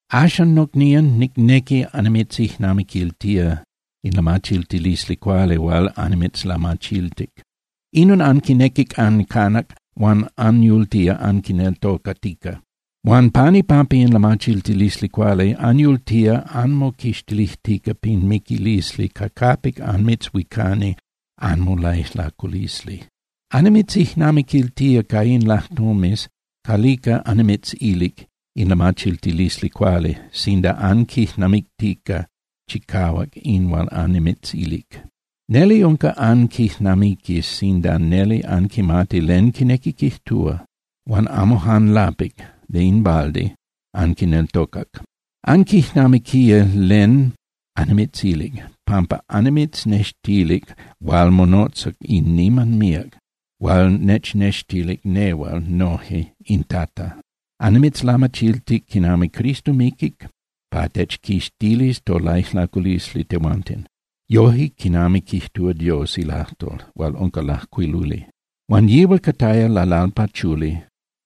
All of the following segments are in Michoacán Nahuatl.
Axan, nocnían, nicnequi annimitzijnamiquiltía in lamachiltilisli cuali hual annimitzlamachiltic. Inon anquinequic ancanac huan anyultía anquineltocatica. Huan pan ipampa in lamachiltilisli cuali anyultía anmoquixtilijtica pin miquilisli ca capic anmitzhuicani anmolaijlaculisli. Annimitzijnamiquiltía ca in lajtomes calica annimitzilic in lamachiltilisli cuali, sinda anquijnamictica chicahuac in hual annimitzilic. Neli unca anquijnamiquis sinda neli anquimati len quinequi quijtúa, huan amo jan lapic (de in balde) anquineltocac. Anquijnamiquía len annimitzilic, pampa annimitznextilic hual monotza in niman míac, hual nechnextilic nehual noje in Tata. Annimitzlamachiltic quinami Cristo miquic pa techquixtilis tolaijlaculisli tehuanten, yoje quinami quijtúa Dios ilajtol hual unca lajcuiluli. Huan yihual cataya lalalpachuli,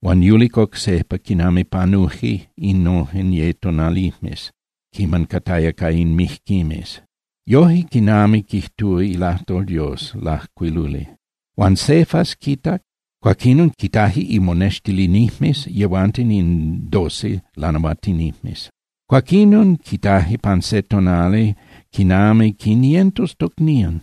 huan yulic oc sejpa quiman panuje innojen ye tonalijmes quiman cataya ca in mijquimes, yoje quinami quijtúa ilajtol Dios lajcuiluli. Huan Cefas quitac, cuaquinon quitaje imonextilinijmes yehuanten in Doce lanahuatinijmes. Cuaquinon quitaje pan se tonali quinami quinientos tocnían,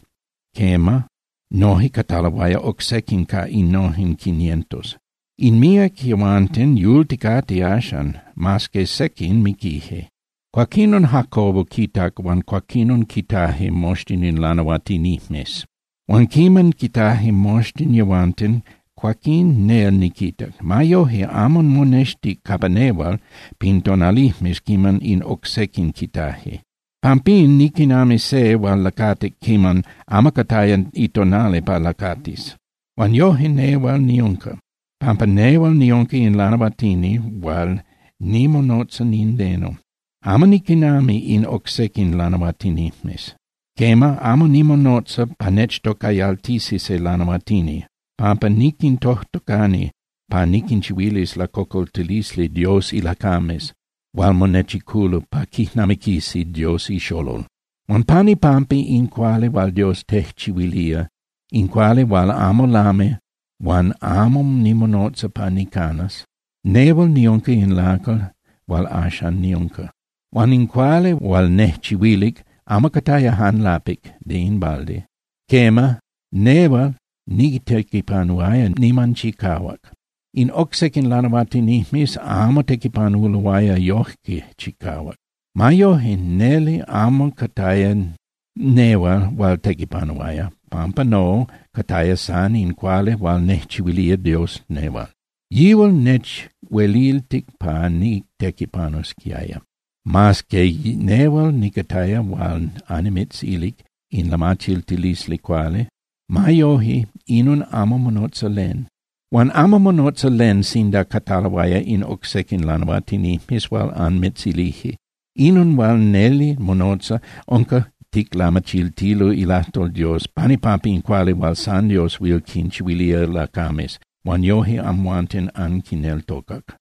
quema, noje cataloaya oc sequin ca innojen quinientos. In míac yehuanten yulticate axan, mas que sequin miquije. Cuaquinon Jacobo quitac huan cuaquinon quitaje moxtin in lanahuatinijmes. Huan quiman quitaje moxtin yehuanten, cuaquín nel niquitac. Ma yoje, amo monextic capa nehual pin tonalijmes quiman in oc sequin quitaje. Pampín niquinami se hual lacatic quiman amo cataya itonali pa lacatis. Huan yoje nehual niunca, pampa nehual niunca in lanahuatini hual nimonotza nindeno, amo niquinami in oc sequin lanahuatinijmes. Quema, amo nimonotza pa nechtocayaltisi se lanahuatini, pampa niquintojtocani pa niquinchihuilis lacocoltilisli Dios ilacames hual monechiculo pa quijnamiquisi Dios iXolol. Huan pan ipampa in cuali hual Dios tejchihuilía, in cuali hual amo lami huan amo nimonotza pa nicanas, nehual niunca in lacal hual axan niunca. Huan in cuali hual nejchihuilic amo cataya jan lapic (de in balde). Quema, nehual nitequipanuaya niman chicahuac. In oc sequin lanahuatinijmes amo tequipanuloaya yoje chicahuac. Ma yoje, neli amo cataya nehual hual tequipanuaya, pampa no, cataya san in cuali hual nejchihuilía Dios nehual. Yihual nechueliltic pa nitequipanusquiaya. Mas que nehual nicataya hual annimitzilic in lamachiltilisli cuali, ma yoje, inon amo monotza len. Huan amo monotza len sinda cataloaya in oc sequin lanahuatinijmes hual anmitzilije. Inon hual neli monotza unca ticlamachiltilo ilajtol Dios pan ipampa in cuali hual san Dios huil quinchihuilía lacames, huan yoje amhuanten anquineltocac.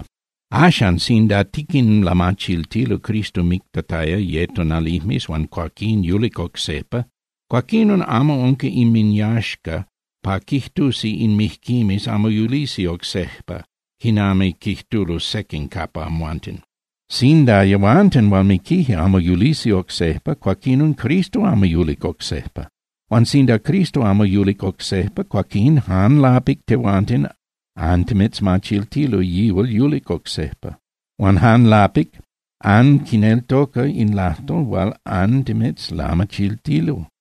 Axan, sinda tiquinlamachiltilo Cristo mictataya ye tonalijmes huan cuaquín yulic oc sejpa, cuaquinon amo unca inminyaxca pa quijtusi in mijquimes amo yulisi oc sejpa, quinami quijtulo sequin capa amhuanten. Sinda yehuanten hual miquije amo yulisi oc sejpa, cuaquinon Cristo amo yulic oc sejpa. Huan sinda Cristo amo yulic oc sejpa, cuaquín jan lapic tehuanten antimitzmachiltilo yihual yulic oc sejpa, huan jan lapic (de balde) anquineltoca in lajtol hual antimitzlamachiltilo.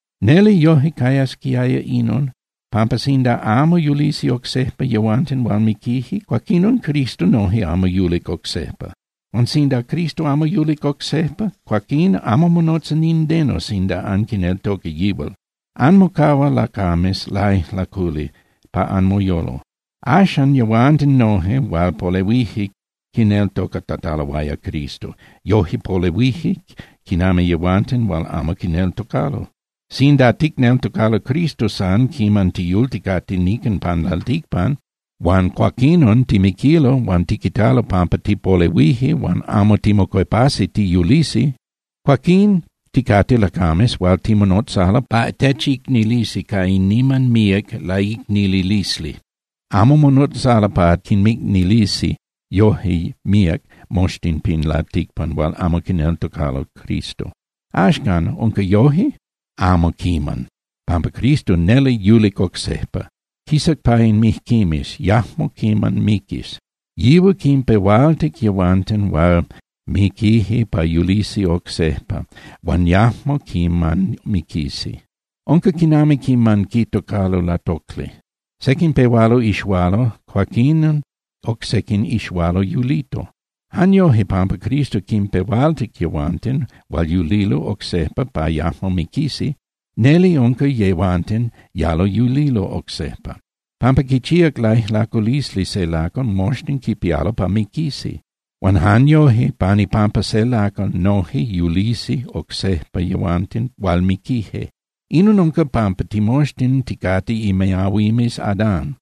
Neli yoje cayasquiaya inon, pampa sinda amo yulisi oc sejpa yehuanten hual miquije, cuaquinon Cristo noje amo yulic oc sejpa. Huan sinda Cristo amo yulic oc sejpa, cuaquín amo monotza nindeno sinda anquineltoca yihual. Anmocahua lacames laijlaculi pa anmoyolo. Axcan yehuanten noje hual polehuije quineltocatataloaya Cristo, yoje polehuije quinami yehuanten hual amo quineltocalo. Sinda ticneltocalo Cristo san quiman tiyulticate nican pan lalticpan, huan cuaquinon timiquilo, huan tiquitalo pampa tipolehuije huan amo timocuepasi tiyulisi, cuaquín ticate lacames hual timonotzalo pa techicnilisi ca in niman míac laicnililisli. Amo monotzalo pa quinmicnilisi yoje míac moxtin pin lalticpan hual amo quineltocalo Cristo. Axcan, ¿unca yoje? Amo quiman, pampa Cristo neli yulic oc sejpa. Quisac pa in mijquimes, yajmo quiman miquis. Yihual quinpehualtic yehuanten hual miquije pa yulisi oc sejpa huan yajmo quiman miquisi. Unca quinami quiman quitocalo latocli. Sequin pehualo ixualo, cuaquín oc sequin ixualo yulito. Jan yoje, pampa Cristo quinpehualtic yehuanten hual yulilo oc sejpa pa yajmo miquisi, neli unca yehuanten yalo yulilo oc sejpa. Pampa quichíac laijlaculisli se lacal, moxtin quipialo pa miquisi. Huan jan yoje pan ipampa se lacal, noje yulisi oc sejpa yehuanten hual miquije. Inon unca pampa timoxtin ticate imiahuimes Adán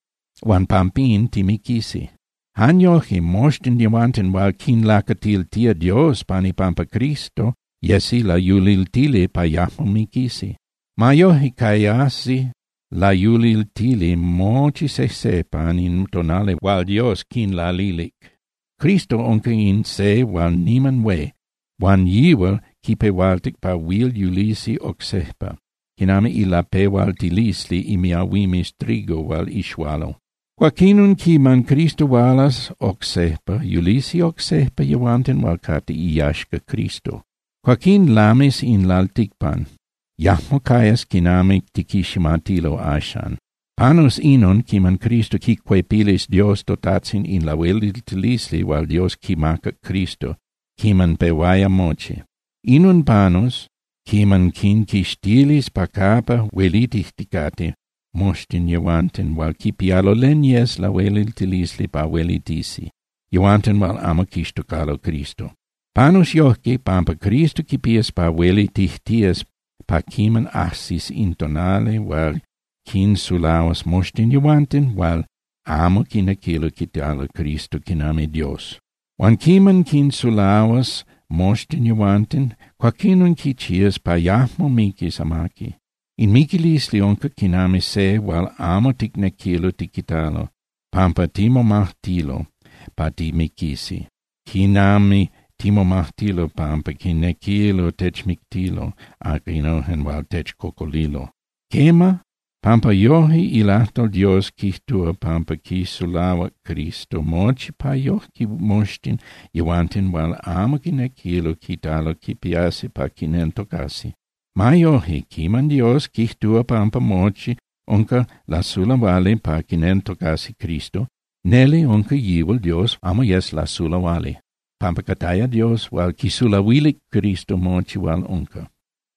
huan pampín timiquisi. Jan yoje moxtin yehuanten hual quinlacatiltía Dios pan ipampa Cristo yesi layuliltili pa yajmo miquisi. Ma yoje, cayasi layuliltili mochi sejse pan in tonali hual Dios quinlalilic. Cristo unca in Se hual niman hué huan yihual quipehualtic pa huil yulisi oc sejpa, quinami ilapehualtilisli imiahuimes trigo hual ixualo. Cuaquinon quiman Cristo hualas oc sejpa, yulisi oc sejpa yehuanten hual cate iyaxca Cristo. Cuaquín lamis in lalticpan, yajmo cayas quinami tiquiximatilo axan. Panus inon quiman Cristo quicuepilis Dios toTajtzin in lahueliltilisli hual Dios quimacac Cristo quiman pehuaya mochi. Inon panus quiman quinquixtilis pa capa huelitijticate moxtin yehuanten hual quipialo len yes lahueliltilisli pa huelitisi, yehuanten hual amo quixtocalo Cristo. Panus yojque pampa Cristo quipías pa huelitijtías pa quiman ajsis in tonali hual quinsulahuas moxtin yehuanten hual amo quinequilo quitalo Cristo quinami Dios. Huan quiman quinsulahuas moxtin yehuanten, cuaquinon quichías pa yajmo miquis amaqui. In miquilisli unca quinami se hual amo ticnequilo tiquitalo pampa timomajtilo pa timiquisi quinami timomajtilo pampa quinequilo techmictilo aquinojen hual techcocolilo. Quema, pampa yoje ilajtol Dios quijtúa pampa quisulahuac Cristo mochi pa yojque moxtin yehuanten hual amo quinequilo quitalo quipiasi pa quineltocasi. Ma yoje, quiman Dios quijtúa pampa mochi unca lasulahuali pa quineltocasi Cristo, neli unca yihual Dios amo yes lasulahuali, pampa cataya Dios hual quisulahuilic Cristo mochi hual unca.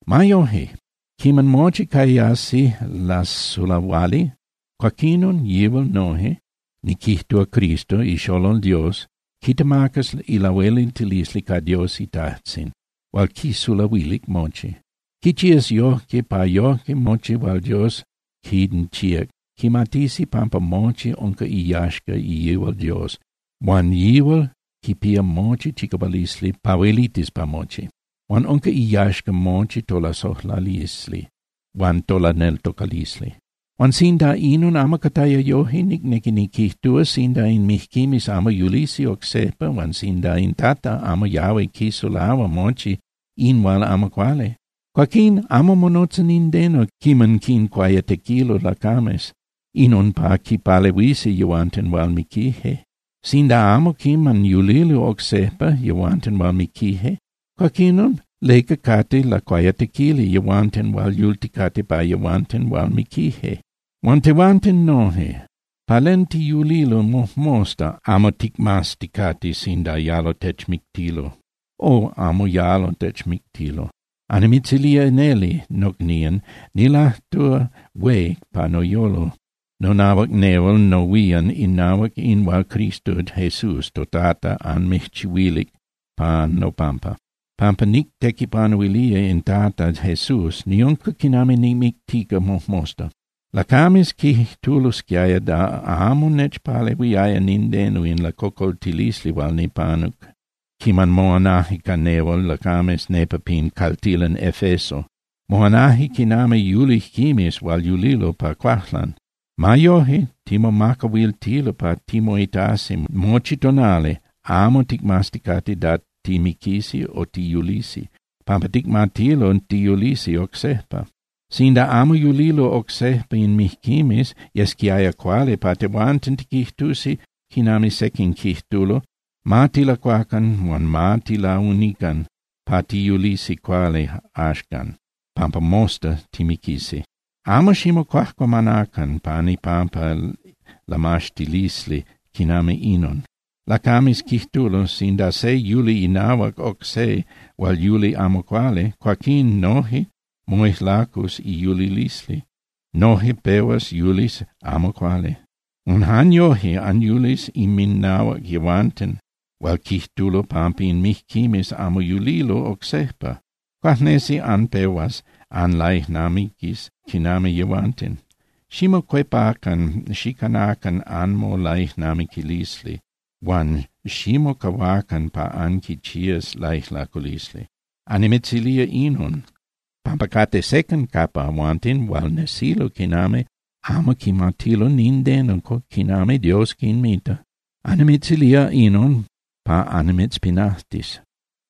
Ma yoje, quiman mochi cayasi lasulahuali, cuaquinon yihual noje, niquijtúa Cristo iXolol Dios, quitemacas ilahueliltilisli ca Dios iTajtzin hual quisulahuilic mochi. Quichías yojque pa yojque mochi hual Dios quinchíac quimatisi pampa mochi unca iyaxca yihual Dios huan yihual quipía mochi chicahualisli pa huelitis pa mochi. Huan unca iyaxca mochi tolasojlalisli huan tolaneltocalisli. Huan sinda inon amo cataya yoje, nicnequi niquijtúa, sinda in mijquimes amo yulisi oc sejpa huan sinda in Tata amo yahui quisulahua mochi in hual amo cuali, cuaquín amo monotza nindeno quiman quincuayatequilo lacames, inon pa quinpalehuisi yehuanten hual miquije. Sinda amo quiman yulilo oc sejpa yehuanten hual miquije, cuaquinon ¿leca cate lacuayatequili yehuanten hual yulticate pa yehuanten hual miquije? Huan tehuanten noje, ¿pa len tiyulilo mojmosta amo ticmazticate sinda yalo techmictilo o amo yalo techmictilo? Annimitzilía neli, nocnían, nilajtúa hué pa noyolo nonahuac nehual nohuían inahuac in hual Cristo Jesús toTata anmijchihuilic pan nopampa. Pampa nictequipanuilía in Tata Jesús niunca quinami nimictica mojmosta. Lacames quijtulosquiaya da amo nechpalehuiaya nindeno in lacocoltilisli hual nipanuc quiman moanaje ca nehual lacames nepa pin caltilan Efeso. Moanaje quinami yulijquimes hual yulilo pa cuajlan. Ma yoje, timomacahuiltilo pa timoitasi mochi tonali amo ticmazticate da timiquisi o tiyulisi, pampa ticmatilo tiyulisi oc sejpa. Sinda amo yulilo oc sejpa in mijquimes, yesquiaya cuali pa tehuanten tiquijtusi quinami sequin quijtulo: “Ma tilacuacan huan ma tilaunican pa tiyulisi cuali axan, pampa mosta timiquisi.” Amo ximocuajcuamanacan pan ipampa lamaxtilisli quinami inon. Lacames quijtulo: “Sinda se yuli inahuac oc se hual yuli amo cuali, cuaquín noje moijlacus iyulilisli, noje pehuas yulis amo cuali.” Huan jan yoje, anyulis inminahuac yehuanten hual quijtulo pampa in mijquimes amo yulilo oc sejpa. Cuajnesi anpehuas anlaijnamiquis quinami yehuanten. Ximocuepacan xicanacan anmolaijnamiquilisli huan ximocahuacan pa anquichías laijlaculisli. Annimitzilía inon, pampa cate sequin capa amhuanten hual nesilo quinami amo quimatilo nindeno quinami Dios quinmita. Annimitzilía inon pa annimitzpinajtis.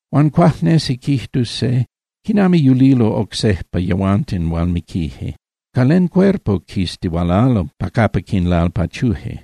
Huan cuajnesi quijtus se: “¿Quinami yulilo oc sejpa yehuanten hual miquije? ¿Ca len cuerpo quistihualalo pa capa quinlalpachuje?”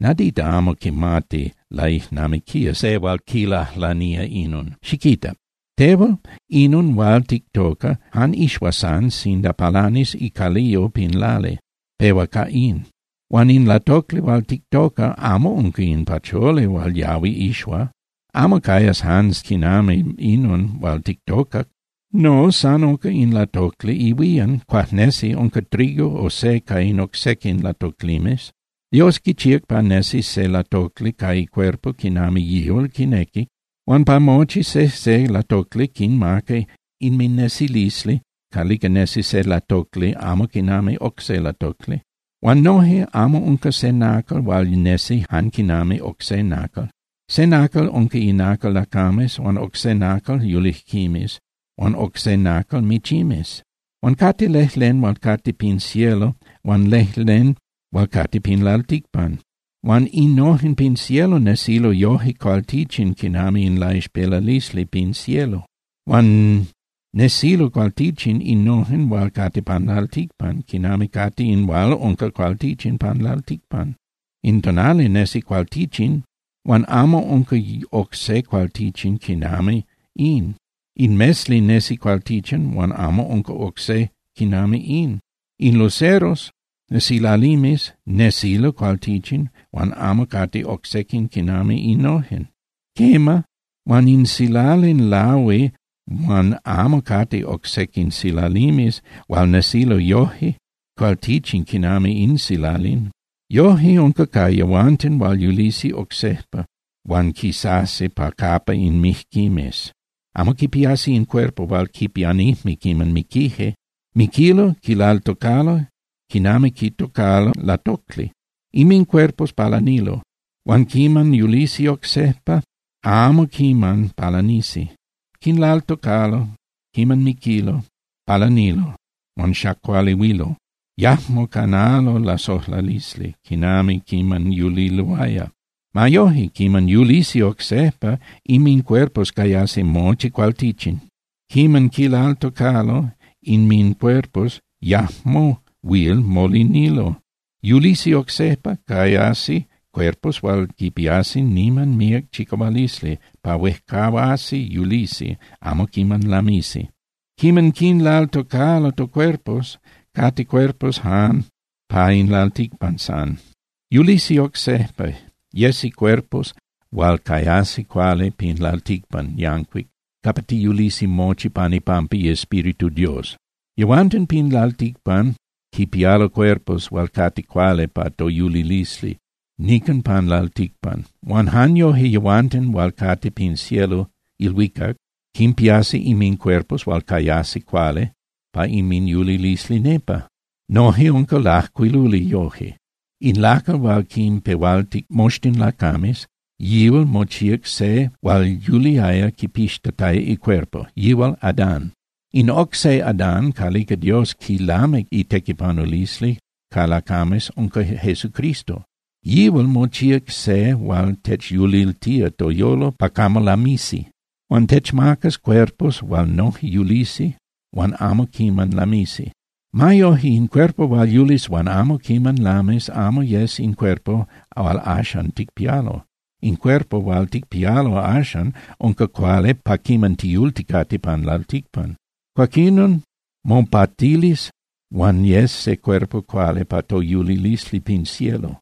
Nadita amo quimati laijnamiquía se hual quilajlanía inon. Xiquita. Tehual, inon hual tictoca jan ixua san sinda palanis icaliyo pin lali, pehua ca in. Huan in latocli hual tictoca amo unca in pacholi hual yahui ixua, amo cayas jan quinami inon hual tictocac. No, san unca in latocli ihuían, cuajnesi unca trigo o se ca in oc sequin latoclimes. Dios quichíac pa nesis se latocli ca icuerpo quinami yihual quinequic. Huan pa mochi sejse latocli quinmaca inminesilisli calica nesi se latocli amo quinami oc se latocli. Huan noje, amo unca se nacal hual nesi jan quinami oc se nacal. Se nacal unca inacal lacames huan oc se inacal yulijquimes huan oc se inacal michimes. Huan cate lejlen hual cate pin cielo huan lejlen hual cate pin lalticpan. Huan innojen pin cielo nesilo yoje cualtichin quinami in laixpelalisli pin cielo. Huan nesilo cualtichin innojen hual cate pan lalticpan quinami cate in hual unca cualtichin pan lalticpan. In tonali nesi cualtichin huan amo unca oc se cualtichin quinami in. In mesli nesi cualtichin huan amo unca oc se quinami in. In luceros (silalimes) nesilo cualtichin huan amo cate oc sequin quinami innojen. Quema, huan se silalin lahui huan amo cate oc sequin silalimes hual nesilo yoje cualtichin quinami in silalin. Yoje unca ca yehuanten hual yulisi oc sejpa hual quisasi pa capa in mijquimes. Amo quipiasi in cuerpo hual quipianijme quiman miquije. Miquilo, quilaltocalo quinami quitocalo latocli. Inmincuerpos palanilo, huan quiman yulisi oc sejpa amo quiman palanisi. Quinlaltocalo quiman miquilo, palanilo, huan xacualihuilo, yajmo canalo lasojlalisli quinami quiman yuliloaya. Ma yoje quiman yulisi oc sejpa, inmincuerpos cayasi mochi cualtichin. Quiman quinlaltocalo inmincuerpos, yajmo huil molinilo. Yulisi oc sejpa, cayasi cuerpos hual quipiasi niman míac chicahualisli pa huejcahuasi yulisi, amo quiman lamisi. Quiman quinlaltocalo tocuerpos, cate cuerpos jan pa in lalticpan san. Yulisi oc sejpa, yesi cuerpos hual cayasi cuali pin lalticpan yancuic capa tiyulisi mochi pan ipampa iEspíritu Dios. Yehuanten pin lalticpan quipialo cuerpos hual cate cuali pa toyulilisli nican pan lalticpan. Huan jan yoje yehuanten hual cate pin cielo (ilhuicac) quinpiasi inmincuerpos hual cayasi cuali pa inminyulilisli nepa. Noje unca lajcuiluli yoje: “In lacal hual quinpehualtic moxtin lacames, yihual mochíac se hual yuliaya quipixtataya icuerpo, yihual Adán.” In oc se Adán calica Dios quilamic itequipanulisli ca lacames unca Jesucristo, yihual mochíac se hual techyuliltía toyolo pa camo lamisi. Huan techmacas cuerpos hual noje yulisi huan amo quiman lamisi. Ma yoje, in cuerpo hual yulis huan amo quiman lamis amo yes in cuerpo hual axan ticpialo. In cuerpo hual ticpialo axan unca cuali pa quiman tiyulticate pan lalticpan. Cuaquinon mopatilis huan yes se cuerpo cuali pa toyulilisli pin cielo.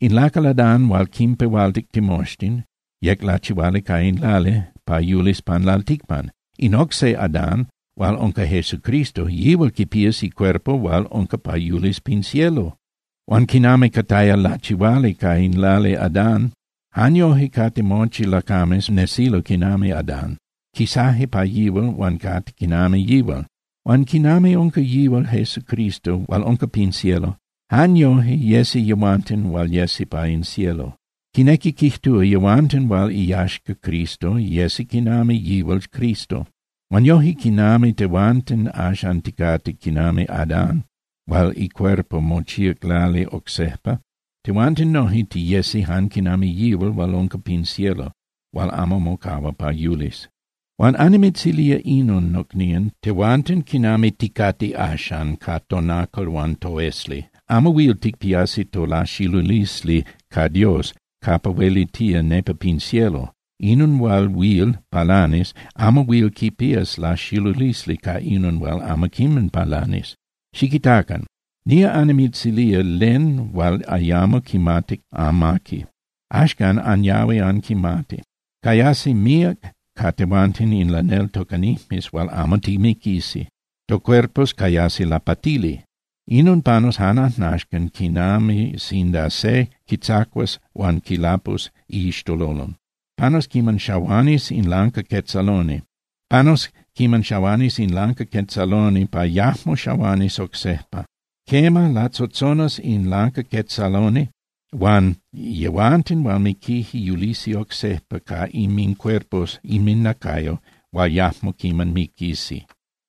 In lacal Adán hual quinpehualtic timoxtin yec lachihuali ca in lali pa yulis pan lalticpan. In oc se Adán hual unca Jesucristo, yihual quipías icuerpo hual unca pa yulis pin cielo. Huan quinami cataya lachihuali ca in lali Adán, jan yoje cate mochi lacames, nesilo quinami Adán, quisaje pa yihual huan cate quinami yihual. Huan quinami unca yihual Jesucristo hual unca pin cielo, jan yoje yesi yehuanten hual yesi pa in cielo. Quinequi quijtúa yehuanten hual iyaxca Cristo, yesi quinami yihual Cristo. Huan yoje quinami tehuanten axan ticate quinami Adán hual icuerpo mochíac lali oc sejpa, tehuanten noje tiyesi jan quinami yihual hual unca pin cielo hual amo mocahua pa yulis. Huan annimitzilía inon, nocnían, tehuanten quinami ticate axan ca tonacal huan toesli amo huil ticpiasi tolaxilulisli ca Dios capa huelitía nepa pin cielo. Inon hual huil palanis amo huil quipías laxilulisli ca inon hual amo quiman palanis. Xiquitacan. Nía annimitzilía len hual ayamo quimatic amaqui. Axcan anyahui anquimati. Cayasi míac ca tehuanten in laneltocanijmes hual amo timiquisi. Tocuerpos cayasi lapatili. Inon panus jan ajnaxcan quinami sinda se quitzacuas huan quilapus iixtololon, panus quiman xahuanis in lancaquetzaloni, panus quiman xahuanis in lancaquetzaloni pa yajmo xahuanis oc sejpa. Quema, latzotzonas in lancaquetzaloni huan yehuanten hual miquije yulisi oc sejpa ca inmincuerpos (inminacayo) hual yajmo quiman miquisi.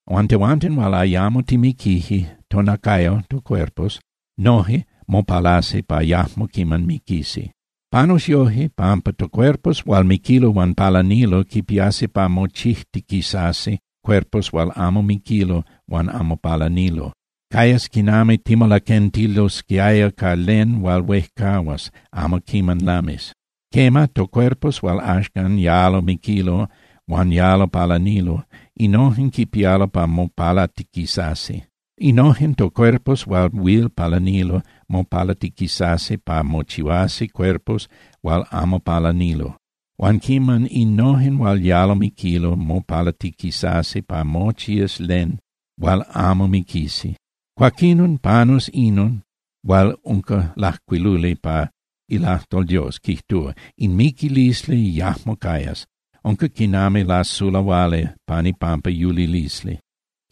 Huan tehuanten hual ayamo timiquije, tonacayo (tocuerpos) noje mopalasi pa yajmo quiman miquisi. Panus yoje, pampa tocuerpos hual miquilo huan palanilo quipiasi pa mochijtiquisasi cuerpos hual amo miquilo huan amo palanilo, cayas quinami timolaquentilosquiaya ca len hual huejcahuas, amo quiman lamis. Quema, tocuerpos hual axcan yalo miquilo huan yalo palanilo, innojen quipialo pa mopalatiquisasi. Innojen tocuerpos hual huil palanilo mopalatiquisasi pa mochihuasi cuerpos hual amo palanilo. Huan quiman innojen hual yalo miquilo mopalatiquisasi pa mochías len hual amo miquisi, cuaquinon panus inon hual unca lajcuiluli pa ilajtol Dios, quijtúa: “In miquilisli yajmo cayas, unca quinami lasulahuali pan ipampa yulilisli.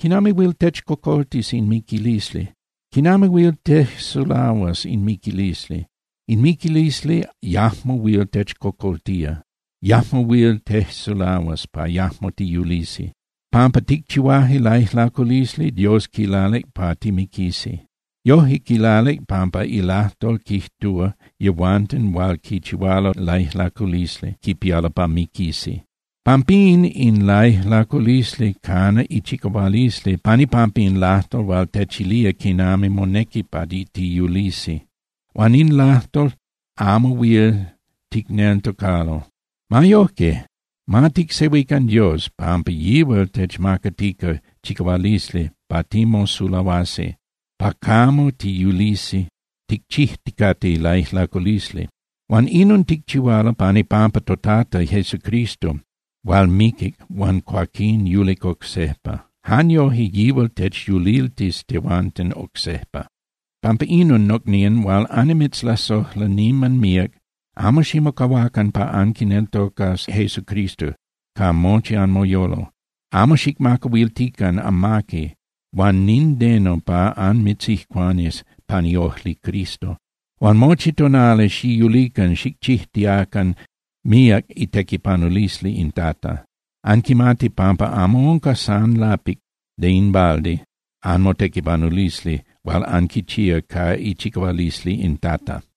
¿Quinami huil techcocoltis in miquilisli? ¿Quinami huil tejsulahuas in miquilisli? In miquilisli yajmo huil techcocoltía, yajmo huil tejsulahuas pa yajmo tiyulisi.” Pampa ticchihuaje laijlaculisli, Dios quilalic pa timiquisi. Yoje quilalic pampa ilajtol quijtúa yehuanten hual quichihualo laijlaculisli quipialo pa miquisi. Pampín in laijlaculisli cana ichicahualisli pan ipampa in lajtol hual techilía quinami monequi pa tiyulisi. Huan in lajtol amo huil ticneltocalo. Ma yojque, ma ticsehuican Dios, pampa yihual techmacatica chicahualisli pa timosulahuasi pa camo tiyulisi ticchijticate laijlaculisli. Huan inon ticchihualo pan ipampa toTata Jesucristo hual miquic huan cuaquín yulic oc sejpa. Jan yoje, yihual techyuliltis tehuanten oc sejpa. Pampa inon, nocnían hual annimitzlasojla niman míac, amo ximocahuacan pa anquineltocas Jesucristo ca mochi anmoyolo. Amo xicmacahuiltican amaqui huan nindeno pa anmitzijcuanis pan iojli Cristo. Huan mochi tonali xiyulican xicchijtiacan míac itequipanulisli in Tata. Anquimati pampa amo unca san lapic (de in balde) anmotequipanulisli hual anquichía ca ichicahualisli in Tata.